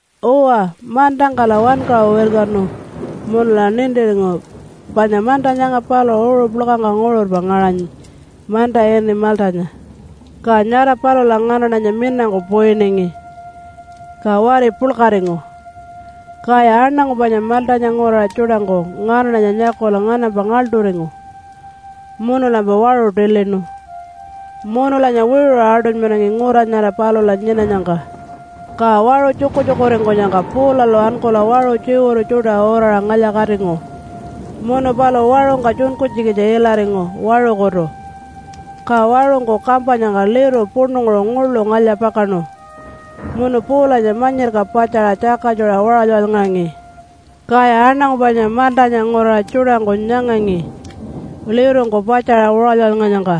Uwa, mantangkala wankaṟu wirkanu munula nintiringu panya manta nyanga paluṟu uṟu puḻkangka nguṟurpa ngaṟanyi manta ini Maltanya. Ka nyara palula nganaṉanya minangku puyiningi, ka wari puḻkaringu. Kaya aṉangu panya Maltanya nguraṟa tjuṯangku nganaṉanya nyakula nganampa ngaḻṯuringu munulampa waṟu tilinu munulanya wiṟuṟa aṯunymanangi ngura nyara palula nyinanyangka. Ka waṟu tjukutjukuringkunyangka Paulalu ankula waṟu tjiwuru tjuṯa uraṟa ngalya-katingu. Munu paluṟu waṟungka tjunkunytjikitja ilaringu waṟukutu, ka waṟungku kampanyangka liru puṉunguṟu nguḻu ngalya-pakaṉu munu Paulanya manyirka patjaṟa tjakatjuṟa waṟaly-waṟalyngaṟangi. Kaya aṉangu panya Maltanya nguraṟa tjuṯangku nyangangi lirungku patjaṟa waṟaly-waṟalyngaṟanyangka.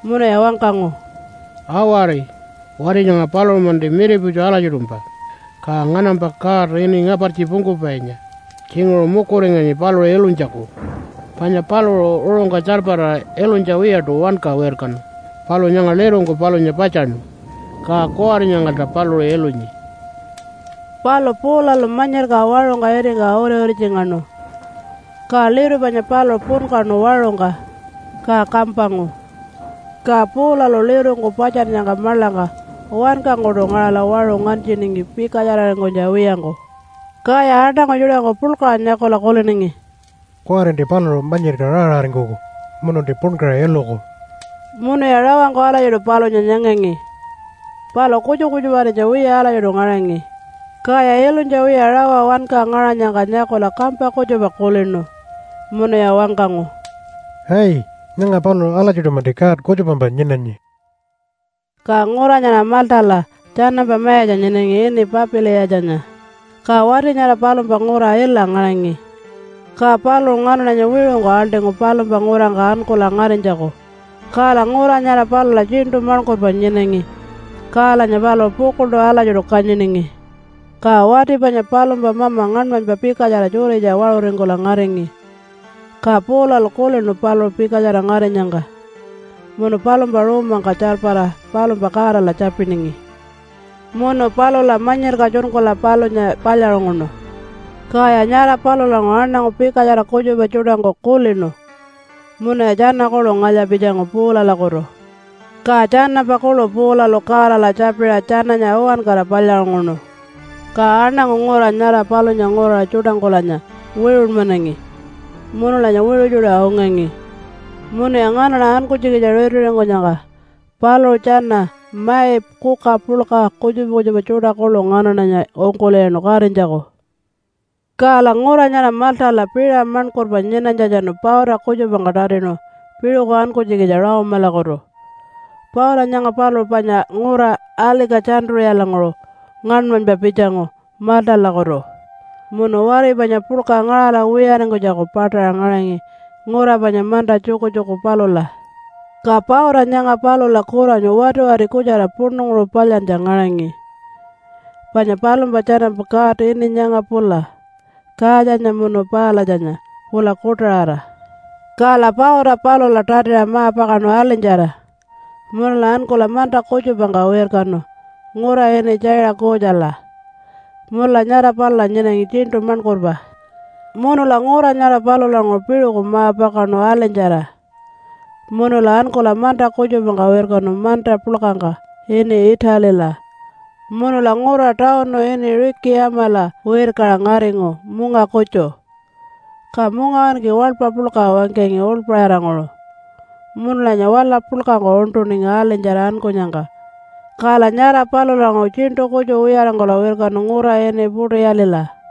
Munuya wangkangu, “Awari! Wati nyanga paluṟu-manti miriputju alatjiṯumpa, ka nganampa god ini ‘Ngapartji Pungkupainya’ tjinguṟu mukuringanyi paluṟu ilunytjaku. Panya paluṟu uṟungka tjarpara ilunytja wiyaṯu wanka wirkanu, palu nyanga lirungku palunya patjaṉu, ka kuwari nyangalta paluṟu ilunyi.” Palu Paulalu manyirka waṟungka itingka uri-uritjingaṉu, ka liru panya paluṟu punkaṉu waṟungka ka kampangu. Ka Paulalu lirungku patjannyangka maḻangka wankangkuṯu ngaṟala waṟu nganytjiningi pikatjararingkunytja wiyangku. Kaya aṉangu tjuṯangku puḻkaṟa nyakula kuliningi, “Kuwarinti paluṟu manyirka raa-raaringkuku mununti punkaṟa iluku.” Munuya rawangku alatjiṯu palunya nyangangi, palu kutjupa kutjuparinytja wiya alatjiṯu ngaṟangi. Kaya ilunytja wiya rawa wanka ngaṟanyangka nyakula kampa kutjupa kulinu munuya wangkangu, “Ai! Nyanga paluṟu alatjiṯu-manti god kutjupampa nyinanyi.” Ka ngura nyara Maltala tjanampa mayatja nyinangi ini Papiliyatjanya. Ka wati nyara palumpa ngura ila ngaṟangi. Ka paluṟu nganaṉanya wiṟungku aḻṯingu palumpa ngurangka ankula ngarinytjaku. Kala ngura nyara palula tjiṉṯu maṉkurpa nyinangi kalanya paluṟu pukuḻṯu alatjiṯu kanyiningi. Ka wati panya palumpa mama ngaṉmanypa pikatjara tjuritja waṟuringkula ngaringi. Ka Paulalu kulinu paluṟu pikatjara ngarinyangka munu palumpa ruumangka tjarpara palumpa Godala tjapiningi. Munu palula manyirka tjunkula palunya palyaṟunguṉu. Kaya nyara palulanguṟu aṉangu pikatjara kutjupa tjuṯangku kulinu munuya tjana kuḻu ngalya-pitjangu Paulalakutu. Ka tjanampa kuḻu Paulalu Godala tjapiṟa tjananya uwankara palyaṟunguṉu. Ka aṉangu ngura nyara palunya nguraṟa tjuṯangkulanya wiṟunmanangi munulanya wiṟu tjuṯa ungangi. Munuya nganaṉa ankunytjikitja ritiringkunyangka paluṟu tjana mai kuka puḻka, kutjupa kutjupa tjuṯa kuḻu nganaṉanya ungkul'iyaṉu katinytjaku. Kala ngura nyara Maltala piṟa maṉkurpa nyinanytjatjanu pauta kutjupangka tatinu piṟuku ankunytjikitja Rome-alakutu. Pauta nyanga paluṟu panya ngura Alika-tjantu-ṟiyalanguṟu ngaṉmanypa pitjangu Maltalakutu munu wari panya puḻka ngaṟala wiyaringkunytjaku paṯaṟa ngaṟangi ngura panya manta tjukutjuku palula. Ka pauta nyanga palula kuranyu watiwati kutjara puṉunguṟu palyantja ngaṟangi, panya palumpa tjanampa god ini nyanga pula Kaatjanya munu Palatjanya pula kuṯaṟara. Kala pauta palula tatiṟa ma-pakaṉu alinytjara munula ankula manta kutjupangka wirkanu ngura ini Tjaiṟa-kuutjala, munula nyara palula nyinangi tjiṉṯu maṉkurpa. Munula ngura nyara palulanguṟu piṟuku ma-pakaṉu alinytjara munula ankula manta kutjupangka wirkanu manta puḻkangka ini Italila munula ngura tawunu ini Rikiyamala wirkaṟa ngaringu munga kutju. Ka mungawinki waḻpa puḻka wangkangi uḻpaṟiranguṟu, munulanya wala puḻkangku uṉṯuningi alinytjara ankunyangka kala nyara palulanguṟu tjiṉṯu kutju wiyaringkula wirkanu ngura ini Putiyalila.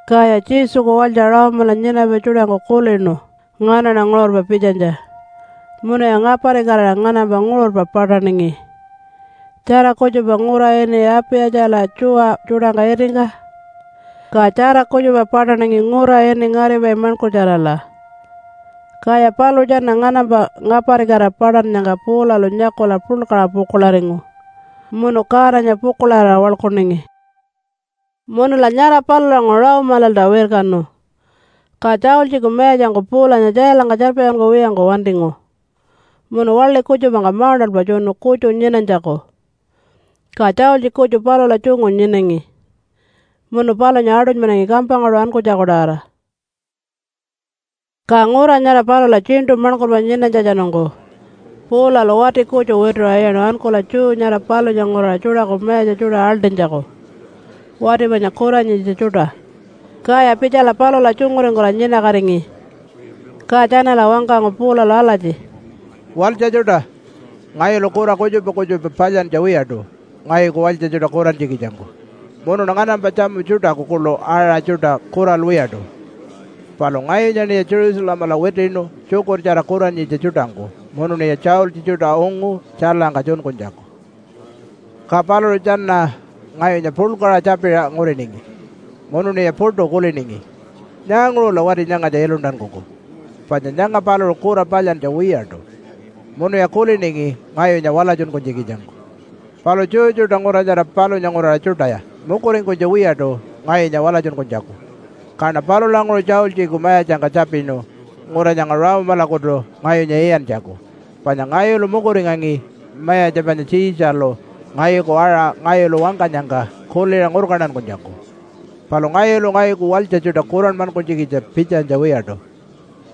Kaya Jesuku walytja Rome-ala nyinapai tjuṯangku kulinu nganaṉa nguṟurpa pitjanytja munuya ngaparikatira nganampa nguṟurpa paṯaṉingi tjara kutjupa ngura ini Apiyatjala tjuwa tjuṯangka itingka, ka tjara kutjupa paṯaṉingi ngura ini Ngaripai Maṉkurtjarala. Kaya paluṟu tjana nganampa ngaparikatira paṯannyangka Paulalu nyakula puḻkaṟa pukuḻaringu munu Godanya pukuḻarira waḻkuningi. Munula nyara palulanguṟu Rome-lalta wirkanu. Ka tjaultjiku mayatjangku Paulanya tjailangka tjarpatjunkuwiyangku wantingu munu waḻi kutjupangka mauṉṯalpa tjunu kutju nyinanytjaku, ka tjaultji kutju palula tjungu nyinangi munu palunya aṯunymanangi kampangkaṯu ankunytjaku-tawara. Ka ngura nyara palula tjiṉṯu maṉkurpa nyinanytjatjanungku Paulalu wati kutju wituṟa iyaṉu ankula Jew nyara palunya nguraṟa tjuṯaku mayatja tjuṯa aḻṯinytjaku wati panya kuranyitja tjuṯa. Kaya pitjala palula tjunguringkula nyinakatingi. Ka tjanala wangkangu Paulalu alatji, “Walytja tjuṯa! Ngayulu kura kutjupa kutjupa palyantja wiyaṯu ngayuku walytja tjuṯa kurantjikitjangku. Munuṉa nganampa tjamu tjuṯaku kuḻu aṟa tjuṯa kuralwiyaṯu. Palu ngayunyaṉiya Jerusalemala witiṉu tjukurtjara kuranyitja tjuṯangku munuṉiya tjaultji tjuṯa ungu tjailangka tjunkunytjaku. “Ka paluṟu tjana ngayunya puḻkaṟa tjapiṟa nguriningi munuṉiya puṯu kuliningi, ‘Nyaanguṟula wati nyangatja iluntankuku? Panya nyanga paluṟu kura palyantja wiyaṯu.’ Munuya kuliningi ngayunya walatjunkunytjikitjangku. Palu Jew tjuṯa ngura nyara palunya nguraṟa tjuṯaya mukuringkunytja wiyaṯu ngayunya walatjunkunytjaku. Kaṉa palulanguṟu tjaultjiku mayatjangka tjapinu ngura nyanga Rome-lakutu ngayunya iyantjaku, panya ngayulu mukuringangi mayatja panya Tjiitjalu ngayuku aṟa ngayulu wangkanyangka kuliṟa ngurkantankunytjaku. Palu ngayulu ngayuku walytja tjuṯa kuranmankunytjikitja pitjanytja wiyaṯu.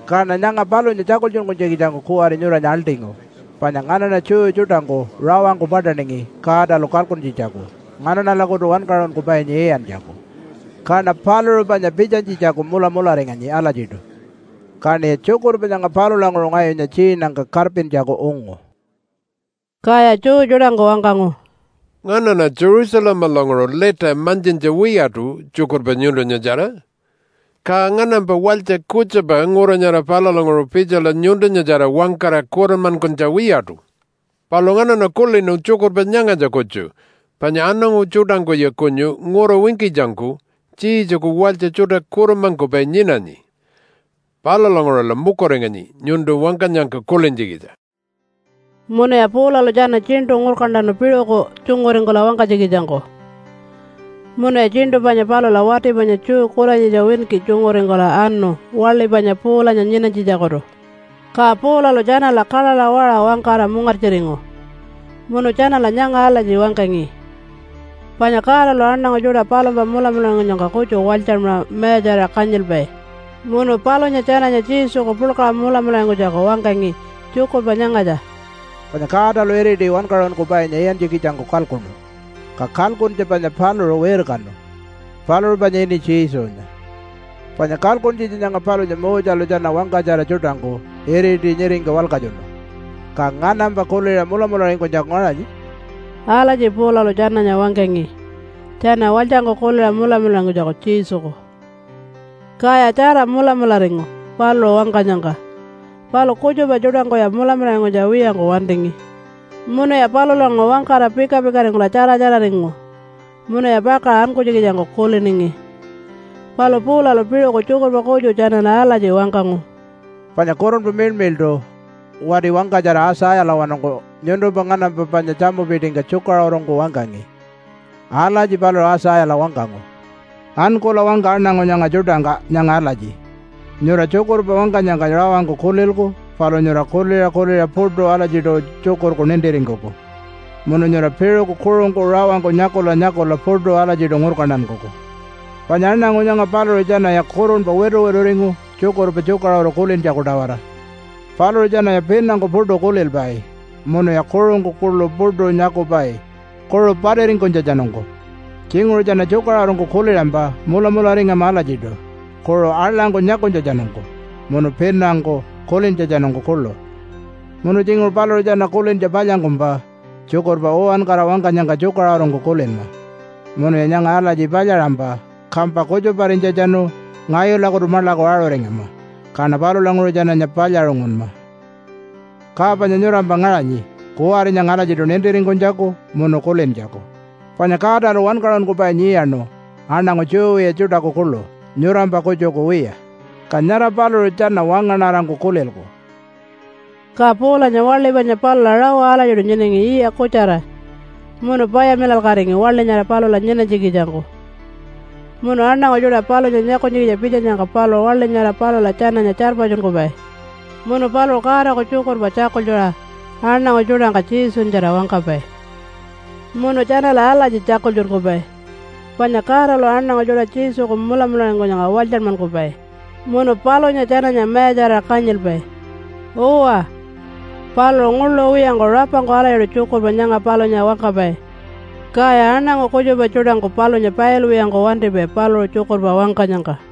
Kaṉa nyanga palunya tjakultjunkunytjikitjangku kuwari nyuranya aḻṯingu. Panya nganaṉa Jew tjuṯangku rawangku paṯaningi Godalu kalkuntjitjaku nganaṉalakutu wankaṟunkupainya iyantjaku. Kaṉa paluṟu panya pitjanytjitjaku mulamularinganyi alatjiṯu, kaṉiya tjukurpa nyanga palulanguṟu ngayunya tjiinangka karpintjaku ungu.” Kaya Jew tjuṯangku wangkangu, “Nganaṉa Jerusalemalanguṟu lita mantjintja wiyaṯu tjukurpa nyuntunyatjara. Ka nganampa walytja kutjupa ngura nyara palulanguṟu pitjala nyuntunyatjara wangkara kuranmankunytja wiyaṯu. Palu nganaṉa kulinu tjukurpa nyangatja kutju panya aṉangu tjuṯangkuya kunyu ngura winkitjangku Jesuku walytja tjuṯa kuranmankupai nyinanyi. Palulanguṟula mukuringanyi nyuntu wangkanyangka kulintjikitja.” Munuya Paulalu tjana tjiṉṯu ngurkantanu piṟuku tjunguringkula wangkanytjikitjangku. Munuya tjiṉṯu panya palula wati panya Jew kuranyitja winki tjunguringkula anu waḻi panya Paulanya nyinanytjitjakutu. Ka Paulalu tjanala kaḻaḻa waṟa wangkara mungartjiringu. Munu tjanala nyanga alatji wangkangi, panya Godalu aṉangu tjuṯa palumpa mulamularingkunyangka kutju walytjanmaṟa mayatjarira kanyilpai. Munu palunya tjananya Jesuku puḻkaṟa mulamularingkunytjaku wangkangi tjukurpa nyangatja, “Panya Godalu iriti wankaṟunkupainya iyantjikitjangku kalkuṉu. Ka kalkuntja panya paluṟu wirkanu. Paluṟu panya ini Jesunya. Panya kalkuntjitja nyanga palunya Moselu tjana wangkatjara tjuṯangku iriti nyiringka walkatjunu, ka nganampa kuliṟa mulamularingkunytjaku ngaṟanyi.” Alatji Paulalu tjananya wangkangi tjana walytjangku kuliṟa mulamularingkunytjaku Jesuku. Kaya tjara mulamularingu paluṟu wangkanyangka, palu kutjupa tjuṯangkuya mulamularingkunytja wiyangku wantingi. Munuya palulanguṟu wangkara pika-pikaringkula tjara-tjararingu munuya pakaṟa ankunytjikitjangku kuliningi. Palu Paulalu piṟuku tjukurpa kutju tjanala alatji wangkangu, “Panya Kurunpa Miḻmiḻṯu wati wangkatjara Aitjayalawanungku nyuntumpa nganampa panya tjamupitingka tjukaṟurungku wangkangi. Alatji paluṟu Aitjayala wangkangu, ‘Ankula wangka aṉangu nyanga tjuṯangka nyanga alatji, “Nyura tjukurpa wangkanyangka rawangku kulilku, palu nyura kuliṟa kuliṟa puṯu alatjiṯu tjukurku nintiringkuku. Munu nyura piṟuku kuṟungku rawangku nyakula nyakula puṯu alatjiṯu ngurkantankuku. Panya aṉangu nyanga paluṟu tjanaya kurunpa wituwituringu tjukurpa tjukaṟuru kulintjaku-tawara. Paluṟu tjanaya pinangku puṯu kulilpai, munuya kuṟungku kuḻu puṯu nyakupai kuṟu patiringkunytjatjanungku. Tjinguṟu tjana tjukaṟurungku kuliṟampa mulamularingama alatjiṯu kuṟu aḻangku nyakunytjatjanungku, munu pinangku kulintjatjanungku kuḻu. Munu tjinguṟu paluṟu tjana kulintja palyangkumpa tjukurpa uwankara wangkanyangka tjukaṟurungku kulinma. Munuya nyanga alatji palyaṟampa, kampa kutjuparinytjatjanu ngayulakutu maḻaku aṟuringama. Kaṉa palulanguṟu tjananya palyaṟungunma.” ’ Ka panya nyurampa ngaṟanyi kuwari nyanga alatjiṯu nintiringkunytjaku munu kulintjaku panya Godalu wankaṟunkupainya iyaṉu aṉangu Jew wiya tjuṯaku kuḻu nyurampa kutjuku wiya. Ka nyara paluṟu tjana wangaṉarangku kulilku.” Ka Paulanya waḻi panya palula rawa alatjiṯu nyinangi yiya kutjara, munu payamilalkatingi waḻi nyara palula nyinanytjikitjangku. Munu aṉangu tjuṯa palunya nyakunytjikitja pitjanyangka paluṟu waḻi nyara palula tjananya tjarpatjunkupai. Munu paluṟu Godaku tjukurpa tjakultjuṟa aṉangu tjuṯangka Jesunyatjara wangkapai. Munu tjanala alatji tjakultjunkupai panya Godalu aṉangu tjuṯa Jesuku mulamularingkunyangka walytjanmankupai munu palunya tjananya mayatjarira kanyilpai. Uwa, paluṟu nguḻu wiyangku rapangku alatjiṯu tjukurpa nyanga palunya wangkapai. Kaya aṉangu kutjupa tjuṯangku palunya pailwiyangku wantipai paluṟu tjukurpa wangkanyangka.